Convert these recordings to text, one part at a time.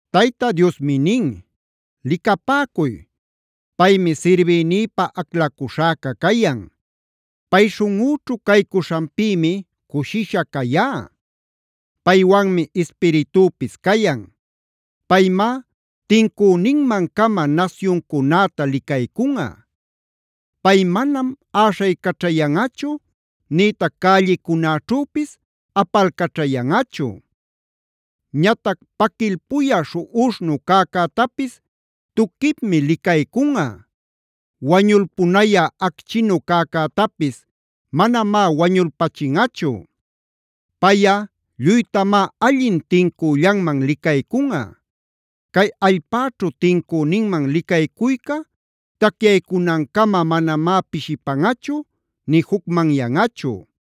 Tayta Diosmi nin: “Licapäcuy, paymi sirbïnïpä aclacuśhäca cayan. Pay śhunꞌüćhua caycuśhanpïmi cushisha cayá. Paywanmi Ispiritüpis cayan. Paymá tincüninmancama nasyuncunäta licaycunꞌa. Pay manam äśhaycaćhayanꞌachu, nïtac cällicunäćhüpis apalcaćhayanꞌachu. Ñatac paquilpuyä śhuꞌuśhnu cäcätapis tuquipmi licaycunꞌa. Wañulpunayä acchinu cäcätapis manamá wañulpachinꞌachu. Payꞌa lluytamá allin tincüllanman licaycunꞌa. Cay allpäćhu tincüninman licaycuyca tacyaycunancama manamá pishipanꞌachu nï jucmanyanꞌachu.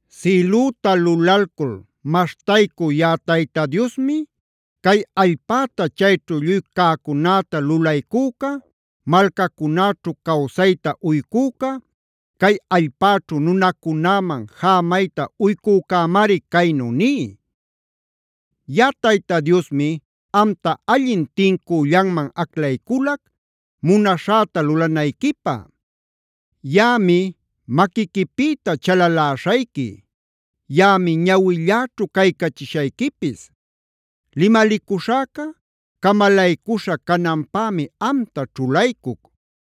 “Sïlüta lulalcul maśhtaycü yaꞌa Tayta Diosmi, cay allpäta chayćhu lluy cäcunäta lulaycüca, malcacunäćhu cawsayta uycüca,c cay allpäćhu nunacunäman jämayta uycücämari caynu ní: ‘Yaꞌa Tayta Diosmi amta allin tincüllanman aclayculac, munaśhäta lulanayquipä. Yaꞌami maquiquipïta chalaläśhayqui; yaꞌami ñawilläćhu caycachishayquipis. Limalicuśhäca camalaycuśha cananpämi amta ćhulaycuc.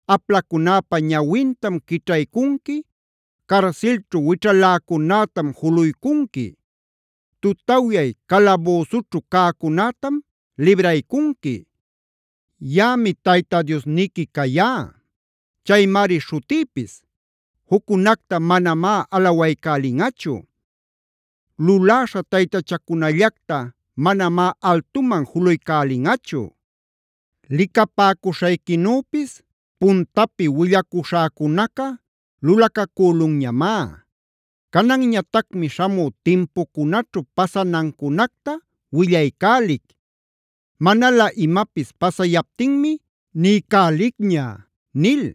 Aplacunäpä ñawintam quićhaycunqui; carsilćhu wićhaläcunätam juluycunqui; tutawyay calabüsućhu cäcunätam libraycunqui. “ ‘Yaꞌami Tayta Diosniqui cayá; chaymari śhutïpis. Juccunacta manamá alawaycälinꞌachu;e luläśha taytachacunallacta manamá altuman juluycälinꞌachu. Licapäcuśhayquinüpis puntapi willacuśhäcunaca lulacacülunñamá. Cananñatacmi śhamü timpucunaćhu pasanancunacta willaycälic. Manalä imapis pasayaptinmi niycälicña’” nil.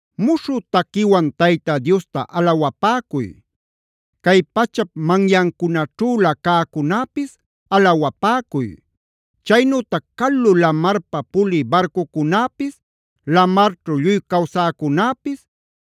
Muśhü taquiwan Tayta Diosta alawapäcuy. Cay pachap manyancunaćhülä cäcunäpis alawapäcuy. Chaynütac calu lamarpa pulï barcucunäpis, lamarćhu lluy cawsäcunäpis,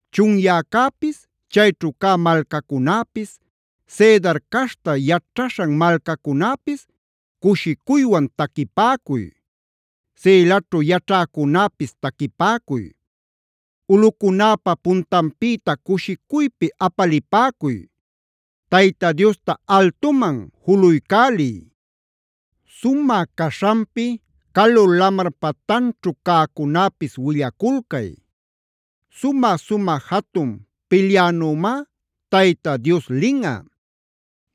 Chunyäcäpis, chayćhu cä malcacunäpis, Cedar caśhta yaćhaśhan malcacunäpis cushicuywan taquipäcuy. Selaćhu yaćhäcunäpis taquipäcuy; ulꞌucunäpa puntanpïta cushicuypi apalipäcuy. Tayta Diosta altuman juluycäliy; sumä caśhanpi calu lamar patanćhu cäcunäpis willaculcay. Sumä-sumä jatun pilyänümá Tayta Dioslinꞌa;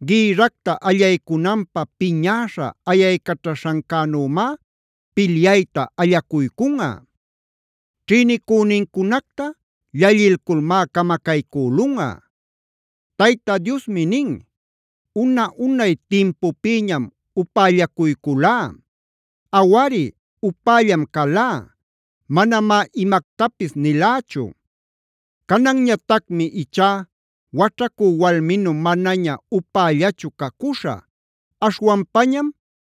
gïrracta allaycunanpä piñäśha ayaycaćhaśhancänümá pilyayta allacuycunꞌa. Ćhïnicünincunacta llallilculmá camacaycülunꞌa. Tayta Diosmi nin: “Una-unay timpupïñam upällacuyculá. Awari, upällam calá; manamá imactapis nilächu. Cananñatacmi ichá waćhacü walminu manaña upällachu cacuśhä, aśhwanpañam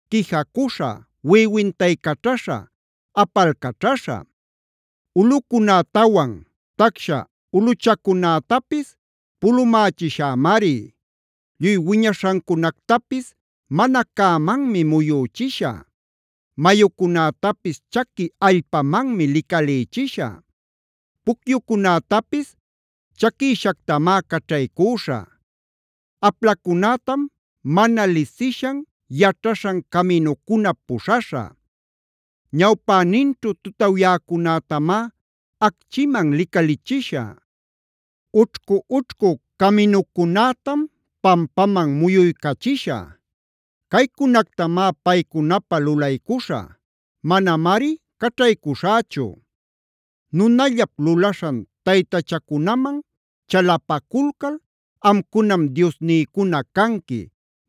quijacuśhä, wiꞌiwintaycaćhaśhä, apalcaćhaśhä. Ulꞌucunätawan tacsha ulꞌuchacunätapis pulumächishämari. Lluy wiñaśhancunactapis mana cämanmi muyüchishä. Mayucunätapis chaqui allpamanmi licalïchishä. Pucyucunätapis chaquïshactamá caćhaycüśhä. Aplacunätam mana lisishan, yaćhaśhan caminucunap puśhaśhä. Ñawpaninćhu tutawyäcunätamá acchiman licalichishä. Ućhcu-ućhcu caminucunätam pampaman muyuycachishä. Caycunactamá paycunapä lulaycuśhä; manamari caćhaycuśhächu. Nunallap lulaśhan taytachacunaman chalapaculcal: ‘Amcunam diosnïcuna canqui’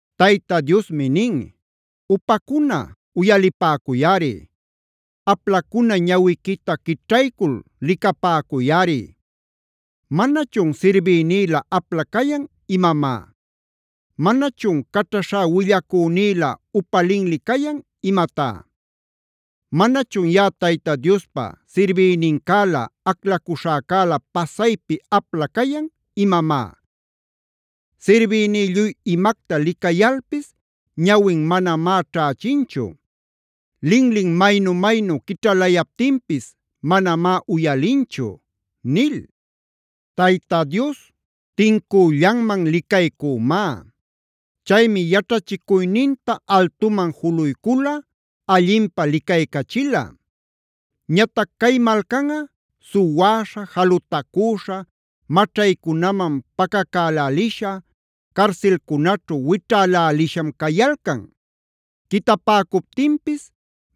Tayta Diosmi nin: “Upacuna, uyalipäcuyꞌari; aplacuna ñawiquita quićhaycul licapäcuyꞌari. ¿Manachun sirbïnïlä apla cayan imamá? ¿Manachun caćhaśhá willacünïlä upa linli cayan imatá? ¿Manachun yaꞌa Tayta Diospa sirbïnincälä, aclacuśhäcäla pasaypi apla cayan imamá? Sirbïní lluy imacta licayalpis ñawin manamá ćhächinchu. Linlin maynu-maynu quićhalayaptinpis manamá uyalinchu” nil. Tayta Dios tincüllanman licaycümá. Chaymi yaćhachicuyninta altuman juluycula, allinpä licaycachila. Ñatac cay malcanꞌa suwäśha, jalutacüśha, maćhaycunaman pacacälälisha, carsilcunaćhu wićhäläliśham cayalcan. Quitapäcuptinpis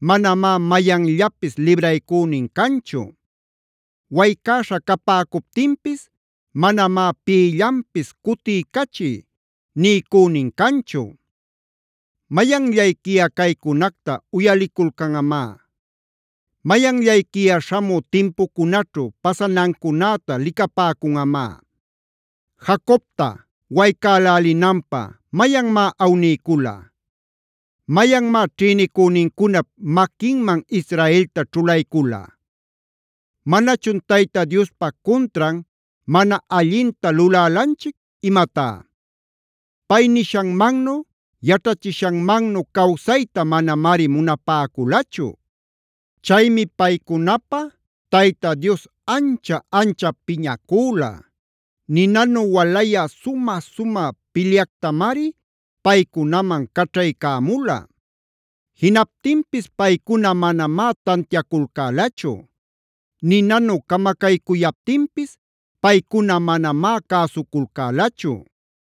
manamá mayanllapis libraycünin canchu; waycäśha capäcuptinpis manamá pïllanpis “cutiycachiy” niycünin canchu. ¿Mayanllayquiꞌa caycunacta uyaliculcanꞌamá? ¿Mayanllayquiꞌa śhamü timpucunaćhu pasanancunäta licapäcunꞌamá? ¿Jacobta waycälälinanpä mayanmá awniycula? ¿Mayanmá ćhïnicünincunap maquinman Israelta ćhulaycüla? ¿Manachun Tayta Diospa cuntran mana allinta lulälanchic imatá? Pay nishanmannu, yaćhachishanmannu cawsayta manamari munapäculachu. Chaymi paycunapä Tayta Dios ancha-anchap piñacüla; ninanu walayä sumä-sumä pilyactamari paycunaman caćhaycämula. Jinaptinpis paycuna manamá tantiaculcälachu; ninanu camacaycuyaptinpis paycuna manamá cäsuculcälachu.